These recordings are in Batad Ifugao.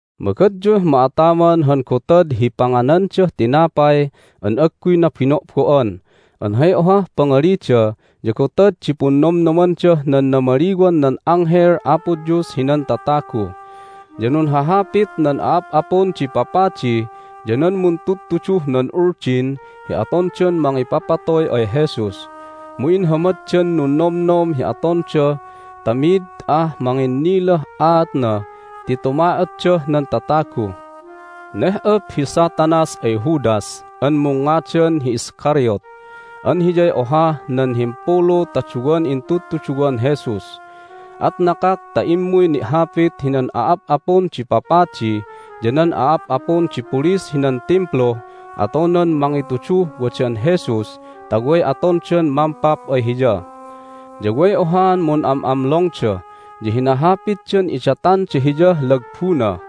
Magadyuh ma'ataman han Gotad hi Panganandah Tinapay an Agguy Nabino'bo'an an hay ohah pangalida ya Gotad di Punnomnomandah nan Namaliwan nan Anghel Apo Dios hinan Tatagu. Ya nunhahapit nan a'ap'apun di papadi ya nan muntudtuduh nan Uldin hi atondan mangipapatoy ay Jesus, mu inhamaddan nunnomnom hi atonda ta mid ah manginnilah aatna ti tuma'otdah nan tatagu. Neh'op hi Satanas ay Judas an mungngadan hi Iscariot an hiyay ohah nan himpulu ta duwan intudtuduwan Jesus. At nakak ta immuy ni'hapit hinan a'ap'apun di papadi ya nan a'ap'apun di pulis hinan Timpluh atonan mangituduh wadan Jesus ta way atondan mampap ay Hiya. Ya way ohaan mun'am'amlongda, ya hinahapitdan idatanda hiyah lagbuna.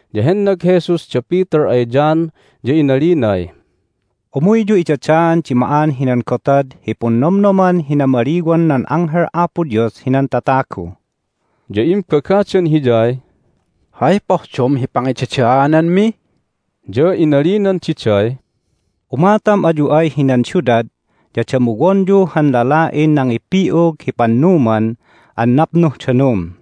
Ya hennag Jesus da Peter ay John, ya inalinay, "Umuyyu idadaan di ma'an hinan gotad hi Punnomnoman hi Namaliwan nan Anghel Apo Dios hinan Tatagu." Ya imbagadan Hiyay, "Hay pohdom hi pangidadaananmi?" Ya inalinan diday, "Umatam ayu ay hinan siudad ya damuwonyu han lala'in nangipi'ug hi pannuman an napnuh danum.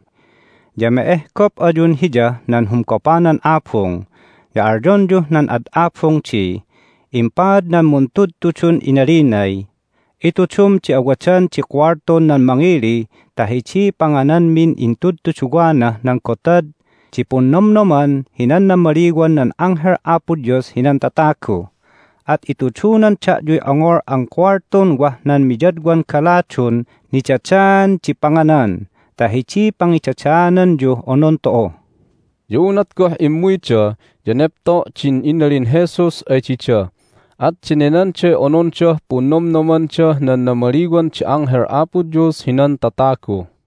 Ya me'ehgop ayun hiyah nan humgopanan abung, ya alyonyuh nan ad abung di, Impaad nan Muntudtudun inalinay, Itudum di awadan di kuwaltun nan mangili ta hidiy pangananmin intudtuduwanah nan Gotad di Punnomnoman hinan Namaliwan nan Anghel Apo Dios hinan Tatagu. At itudunan da'yuy ongol an kuwaltun wah nan miyadwan galadun nidadaan di panganan ta hidiy pangidadaananyuh onon tu'u." Ya unat goh immuyda ya nepto' din inalin Jesus ay dida, at denenanday onondah Punnomnomandah nan Namaliwan di Anghel Apo Dios hinan Tatagu.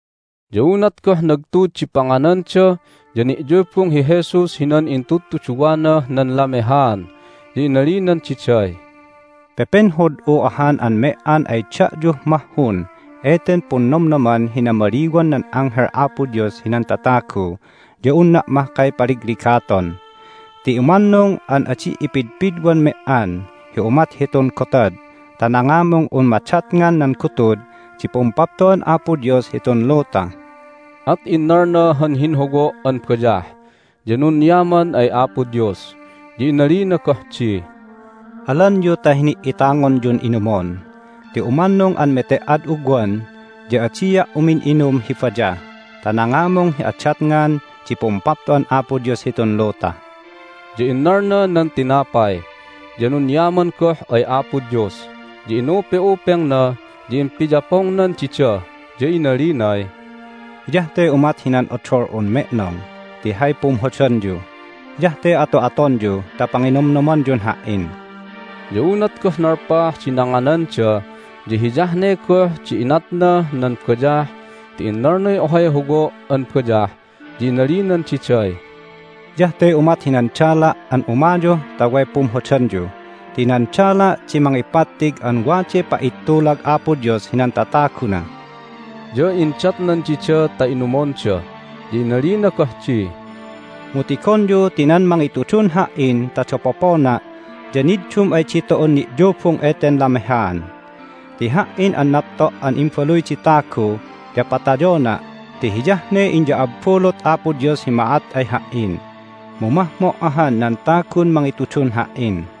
Ya unat goh nagtud di pangananda ya ni'yubung hi Jesus hinan intudtuduwanah nan lamehaan. Ya inalinan diday, "Pepenhod'u ahan an me"an ay da'yuh mahhun eten Punnomnoman hi Namaliwan nan Anghel Apo Dios hinan Tatagu ya unna' mahkay paligligaton ti umannung an adi' ipidpidwan me"an hi umat hitun gotad ta nangamung un madatngan nan gutud di Pumpapto'an Apo Dios hitun luta." At innalna han hinhowo' an bayah, ya nunyaman ay Apo Dios, ya inalina goh di, "Alanyu ta hini"itangonyun inumon ti umannung an mete"ad ugwan ya adia' umin'inum hi bayah ta nangamung hi adatngan di Pumpapto'an Apo Dios hitun luta." Ya innalna nan tinapay, ya nunyaman goh ay Apo Dios, ya inupe'upengna, ya impiyapongnan dida, ya inalinay, "Hiyah te umat hinan odol'un me'nong ti hay pumhodanyu. Hiyah te ato'atonyu ta panginomnomanyun Ha"in." Ya unat goh nalpah di nangananda ya hiyah ne goh di inatnah nan bayah ti innalnay ohay howo' an bayah ya inalinan diday, "Hiyah te umat hinan dala' an umayuh ta way pumhodanyu ti nan dala' di mangipattig an waday pa'ittulag Apo Dios hinan tataguna." Ya indatnan dida ta inumonda. Ya inalina goh di, "Mu tigonyu ti nan mangitudun Ha"in ta dapopona' ya niddum ay ditu'un ni'yubung eten lamehaan. Ti Ha"in an napto' an Imbaluy di Tagu ya patayona' ti hiyah ne inya'abbulut Apo Dios hi ma'at ay Ha"in, mu mahmo' ahan nan tagun mangitudun Ha"in!"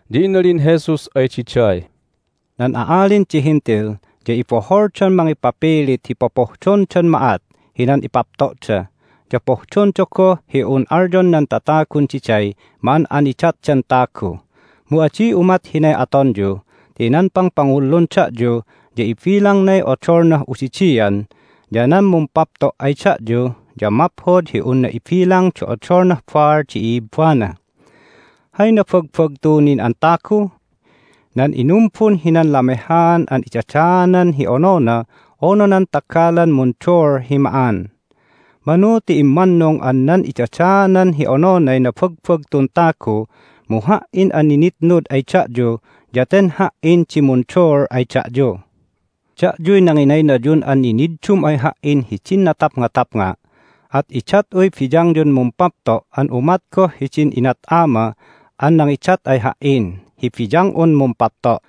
Ya inalin Jesus ay diday, "Nan a'alin di Hentil ya iboholdan mangipapilit hi popohdondan ma'at hinan ipapto'da, ya pohdonda goh hi un alyon nan tatagun diday ma'an'aniddatdan tagu. Mu adi umat hinay atonyu ti nan pangpangullun da'yu ya ibilangnay odolnah udidian, ya nan mumpapto' ay da'yu ya maphod hi unna ibilang di odolnah baal di i'ibbana. Hay nabagbagtu nin an tagu? Nan inumbun hinan lamehaan an idadaanan hi onona unu nan tagalan munduul hi ma'an? Manu ti immannung an nan idadaanan hi ononay nabagbagtun tagu, mu Ha"in an ninitnud ay da'yu ya ten Ha"in di munduul ay da'yu. Da'yuy nanginaynayun an niniddum ay Ha"in hidin natapngatapnga', at idat'uy biyangyun mumpapto' an umat goh hidin inat Ama an nangidat ay Ha"in hi biyang'un mumpapto'.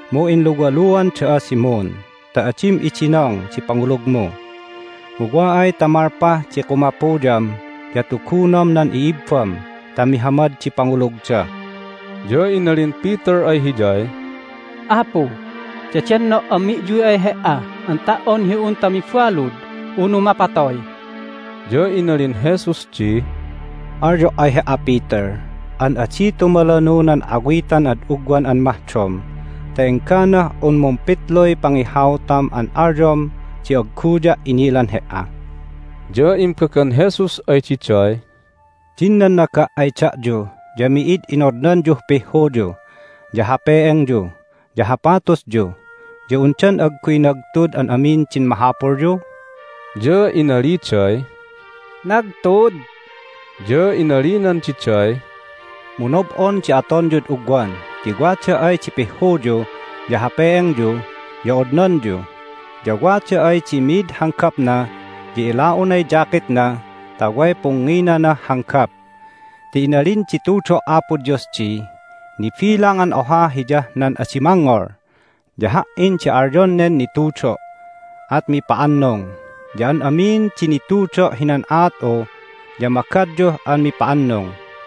Mu inluwaluan da'a, Simon, ta adim idinong di pangulugmu. Mu wa ay ta malpah di kumapuyam ya tugunom nan i'ibbam ta mihamad di pangulugda." Ya inalin Peter ay Hiyay, "Apu, dedenno' an mi'yuy ay He"a an ta"on hi unta mibalud unu mapatoy!" Ya inalin Jesus di, "Alyo' ay he"a, Peter, an adi tumalanu nan awitan ad ugwan an mahdom ta engganah un mumpitluy pangihautam an alyom di agguya' inilan he"a." Ya imbagan Jesus ay diday, "Din nannaga' ay da'yu ya mi'id inodnanyuh pihhuyu, ya hape"engyu, ya hapatusyu ya undan agguy nagtud an amin din mahapulyu?" Ya inaliday, "Nagtud." Ya inalinan diday, "Mu nob'on di atonyud ugwan ti wada ay di pihhuyu ya hape"engyu ya odnanyu. Ya wada ay di mi'id hanggapna ya ila'unay jacketna ta way pungnginanah hanggap. Ti inalin di tudo' Apo Dios di, Nibilang an oha Hiyah nan adi mangngol. Ya Ha"in di alyon nen nitudo', at mipa'annung. Ya an amin di nitudo' hinan aat'u ya magadyuh an mipa'annung."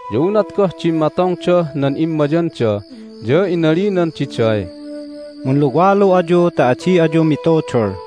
Ya unat goh dimmatongdah nan immayanda ya inalinan diday, "Munluwalu ayu ta adi ayu mitudul."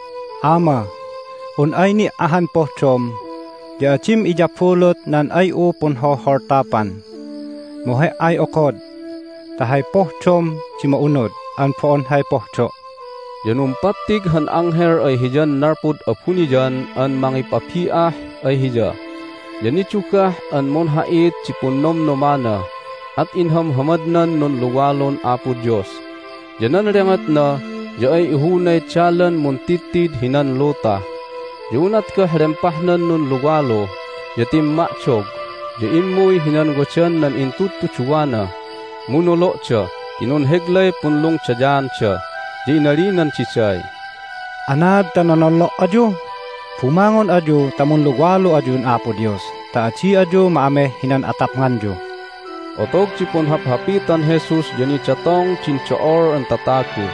"Ama, un ay ni' ahan pohdom ya adim iyabulut nan ay'u punholholtapan! Mu He"ay okod ta hay pohdom di ma'unud an bo'on hay pohdo'." Ya numpattig han anghel ay Hiyan nalpud abuniyan an mangipabi'ah ay Hiya. Ya nidugah an munha'it di punnomnomana, at inhamhamadnan nunluwalun Apo Dios, ya nan lengotna ya ay ihunay dalan muntidtid hinan luta. Ya unat goh lempahnan nunluwalu ya timma'dog, ya immuy hinan wadan nan intudtuduwana, mu nolo'da ti nunheglay punlungdayaanda. Ya inalinan diday, "Anaad ta nonollo' ayu? Bumangon ayu ta munluwalu ayun Apo Dios ta adi ayu ma'ameh hinan atapnganyu!" Hay Nampapandan Jesus Otog di punhaphapitan Jesus ya nidatongda din do'ol an tatagu,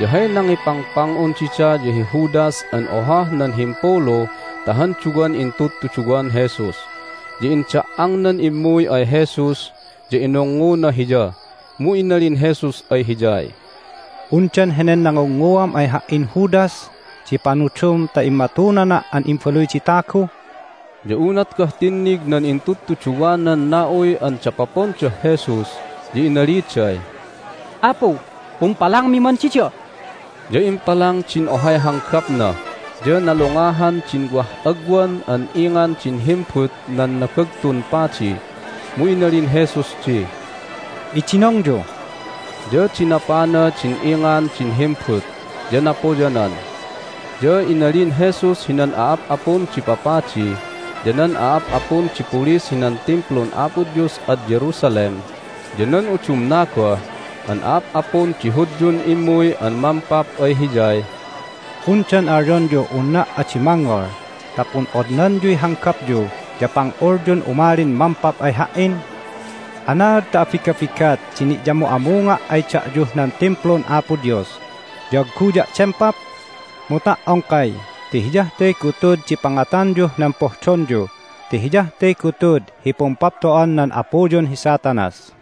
ya hay nangipangpang'un dida ya hi Judas an ohah nan himpulu ta han duwan intudtuduwan Jesus. Ya inda"angnan immuy ay Jesus, ya inungnguna Hiya. Mu inalin Jesus ay hiyay, "Undan henen nangungnguam ay Ha"in, Judas, di panudum ta immatunana' an Imbaluy di Tagu?" Ya unat goh tinnig nan intudtuduwanan na'uy an dapopondah Jesus ya inaliday, "Apu, pumpalangmi man dida?" Ya impalang din ohay hanggapna, ya nalungahan din wah agwan an ingan din himbut nan Nabagtun Padi. Mu inalin Jesus di, "Idinongyu!" Ya dinapana din ingan din himbut, ya napoyanan. Ya inalin Jesus hinan a'ap'apun di papadi, ya nan a'ap'apun di pulis hinan Timplun Apo Dios ad Jerusalem, ya nan udumna goh an a'ap'apun di Hudyun immuy an mampap ay Hiyay, "Undan alyonyuh unna' adi mangngol ta pun'odnanyuy hanggapyu ya pang'ulyun umalin mampap ay Ha"in? Anaad ta abigabigat di ni'yamu'amunga' ay da'yuh nan Timplun Apo Dios ya agguya' dempap? Mu ta"ongkay ti hiyah te gutud hi pangatanyuh nan pohdonyu ti hiyah te gutud hi pumpapto'an nan apuyun hi Satanas."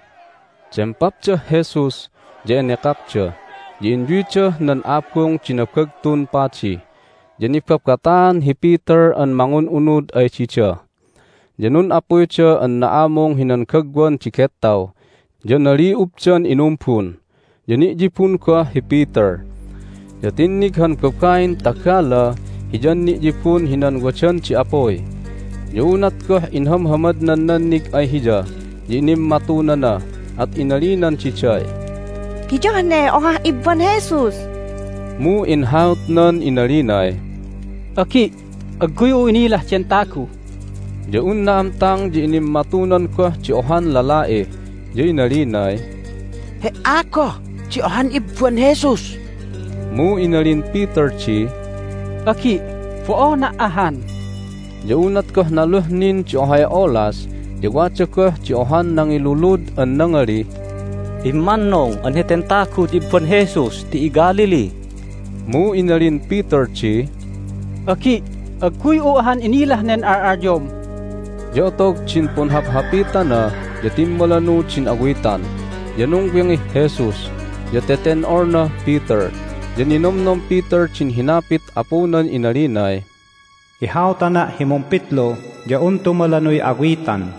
Hay Nangihautan Peter ay Jesus Dempapdah Jesus, ya enekakda, ya inyuydah nan abung di Nabagtun Padi. Ya nibabataan hi Peter an mangun'unud ay dida. Ya nun'apuyda an na'amung hinan gagwan di gettaw, ya nali'ubdan inumbun, ya ni'yibun goh hi Peter. Ya tinnig han babain tagala hiyan ni'yibun hinan wadan di apuy. Ya unat goh inhahammadnan nannig ay hiya ya inimmatunana, at inalinan diday, "Hiyah ne ohah ibban Jesus!" Mu inhautnan inalinay, "Agi', agguy'u inilah den tagu!" Ya un na'amtang ya inimmatunan goh di ohan lala'i, ya inalinay, "He"a goh di ohan ibban Jesus!" Mu inalin Peter di, "Agi', bo'ona' ahan!" Ya unat goh naluh nin di ohay olas ya wada goh di ohan nangilulud an nangalih, "Immannung an heten tagu ya ibban Jesus ti iGalilee!" Mu inalin Peter di, "Agi', agguy'u ahan inilah nen al'alyom!" Ya otog din punhaphapitana ya timmalanu din awitan. Ya nungwingih Jesus, ya teten'olnah Peter, ya ninomnom Peter din hinapit Apunan inalinay, "Ihautana' hi mumpitlu ya un tumalanuy awitan."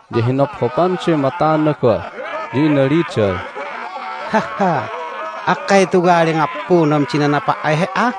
ya hinophopanday matana goh, ya inaliday, "Akkay tuwali ngappunam di nanapa' ay He"a?"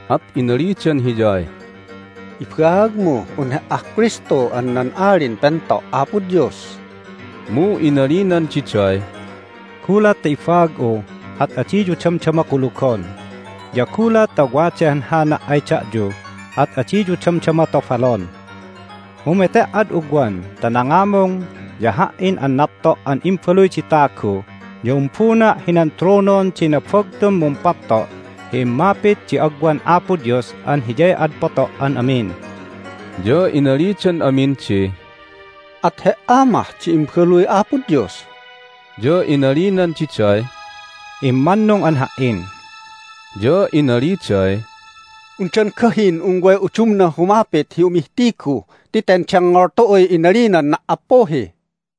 At inalidan Hiyay, "Ibaagmuh un He"ah Kristu an nan Alin Pento' Apo Dios." Mu inalinan diday, "Gulat ta ibaag'u at adiyu damdama kulugon, ya gulat ta waday hanhana' ay da'yu at adiyu damdama tobalon. Mu mete"ad ugwan ta nangamung ya Ha"in an napto' an Imbaluy di Tagu ya umbuna' hinan tronon di nabagtun mumpapto' hi immapit di agwan Apo Dios an Hiyay ad poto' an amin." Ya inalidan amin di, "At He"a mah di Imbaluy Apo Dios?" Ya inalinan diday, "Immannung an Ha"in." Ya inaliday, "Undan gahin un way udumnah humapit hi umihtigu? Ti ten dengngol tu'uy inalinan na"appuhi!"